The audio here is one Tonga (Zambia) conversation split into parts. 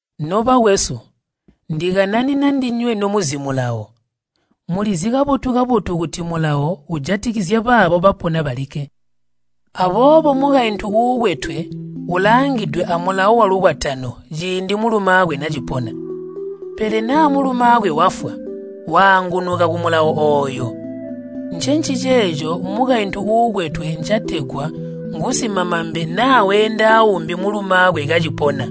Nobakwesu, ndikananina ndinywe nomuzi Mulawo. Mulizi kabotu-kabotu kuti Mulawo ujatikizya baabo bapona balikke. Aboobo mukaintu uukwetwe ulaangidwe amulawo walukwatano ciindi mulumaakwe nacipona. Pele naa mulumaakwe wafwa, waangunuka kumulawo ooyo. Ncenciceeco mukaintu uukwetwe ncategwa ngusimamambe naa weenda aumbi mulumaakwe kacipona.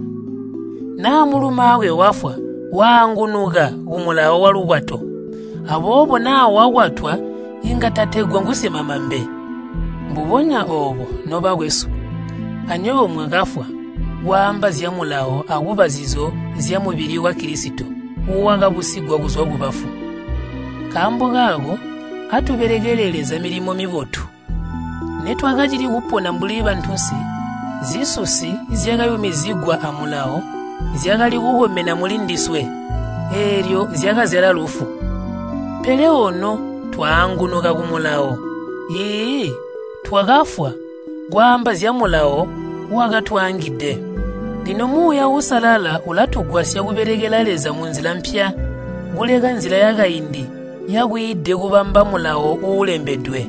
Naa mulumaakwe wafwa, waangunuka kumulawo walukwato, aboobo naa wakwatwa inga tategwa ngusimamambe. Mbubonya oobo, nobakwesu, anywebo mwakafwa kwaamba zya Mulawo akuba zizo zyamubili wa Kilisito wakabusigwa kuzwa kubafu. Nkaambo kaako atubelekele Leza milimo mibotu. Nitwakacili kupona mbuli bantunsi, zisusi zyakayumizigwa a Mulawo zyakali kukomena mulindiswe, eelyo zyakazyala lufu. Pele ono twaangunuka ku Mulawo, iiyi, twakafwa kwaamba zya Mulawo wakatwaangide. Lino Muuya Uusalala ulatugwasya kubelekela Leza munzila mpya, kuleka nzila yakaindi yakwiide kubamba Mulawo uulembedwe.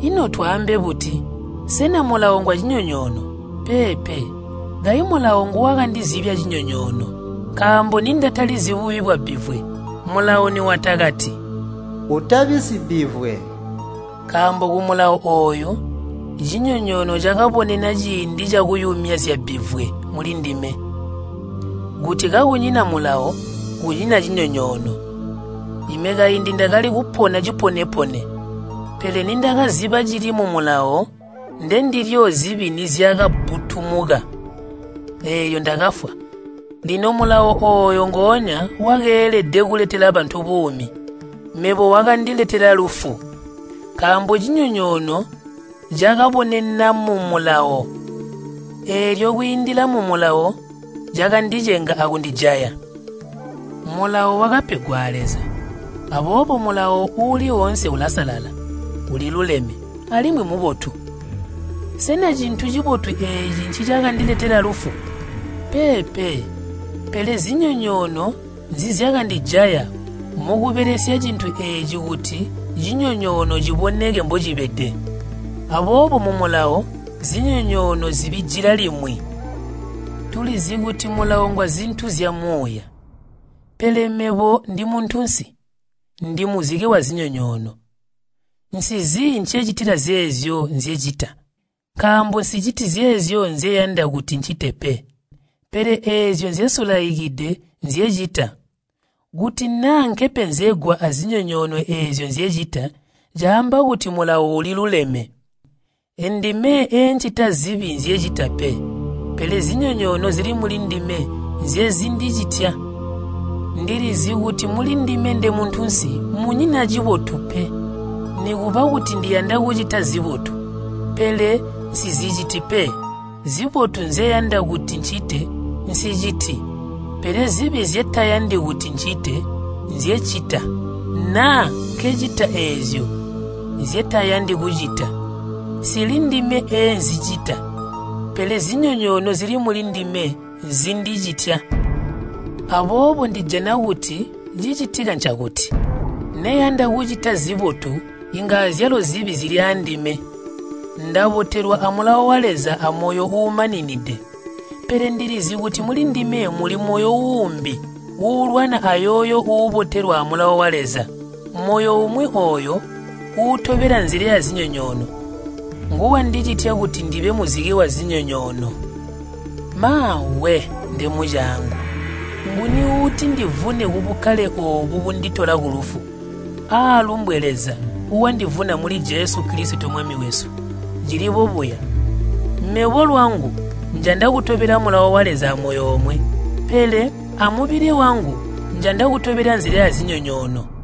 Ino twaambe buti? Sena Mulawo ngwacinyonyoono? Peepe! Kayi Mulawo nguwakandizibya cinyonyoono. Nkaambo nindatalizi bubi bwabbivwe, Mulawo niwatakati, “Utabi sibbivwe.” Nkaambo kumulawo ooyu cinyonyoono cakaabonena ciindi cakuyumya zyabbivwe mulindime. Kuti kakunyina Mulawo, kunyina cinyonyoono. Ime kaindi ndakali kupona cipone-pone, pele nindakaziba cili mu Mulawo, ndendilyo zibi nizyakabbutumuka, eelyo ndakafwa. Lino Mulawo ooyo ngoonya wakeelede kuletela bantu buumi, mebo wakandiletela lufu. Nkaambo cinyonyoono cakaabonena mu Mulawo, eelyo kwiindila mu Mulawo cakandicenga akundijaya. Mulawo wakapegwa a Leza, aboobo Mulawo uuli oonse ulasalala, uliluleme, alimwi mubotu. Sena cintu cibotu eeci ncicakandiletela lufu? Peepe! Pele zinyonyoono nzizyakandijaya mukubelesya cintu eeci kuti cinyonyoono ciboneke mbocibede. Aboobo mu Mulawo, zinyonyoono zibijila limwi. Tulizi kuti Mulawo ngwazintu zyamuuya. Pele mebo ndimuntunsi, ndimuzike wazinyonyoono. Nsizi ncecitila zeezyo nzyecita. Nkaambo nsiciti zeezyo nzeyanda kuti ncite pe, pele eezyo nzyesulaikide nzyecita. Kuti naa nkepenzegwa azinyonyoono eezyo nzyecita, caamba kuti Mulawo uliluleme. Endime eencita zibi nzyecita pe, pele zinyonyoono zili mulindime nzyezindicitya. Ndilizi kuti mulindime ndemuntunsi munyina cibotu pe. Nikuba kuti ndiyanda kucita zibotu, pele nsiziciti pe. Zibotu nzyeyanda kuti ncite, nsiciti. Pele zibi nzyetayandi kuti ncite, nzyecita. Naa nkecita eezyo nzyetayandi kucita, nsilindime eenzicita, pele nzinyonyoono zili mulindime zindicitya. Aboobo ndijana kuti cicitika ncakuti, neyanda kucita zibotu inga azyalo zibi zili aandime. Ndabotelwa a Mulawo wa Leza amoyo uumaninide. Pele ndilizi kuti mulindime muli moyo uumbi uulwana ayooyo uubotelwa a Mulawo wa Leza. Moyo umwi ooyo uutobela nzila yazinyonyoono, nguwandicitya kuti ndibe muzike wazinyonyoono. Maawe! Nde mucaangu! Nguni uutindivune kubukkale oobu bunditola kulufu? Aalumbwe Leza wandivuna muli Jesu Kilisito Mwami wesu! Cili bobuya: mebo lwangu njanda kutobela Mulawo wa Leza amoyo omwe, pele amubili wangu njanda kutobela nzila yazinyonyoono.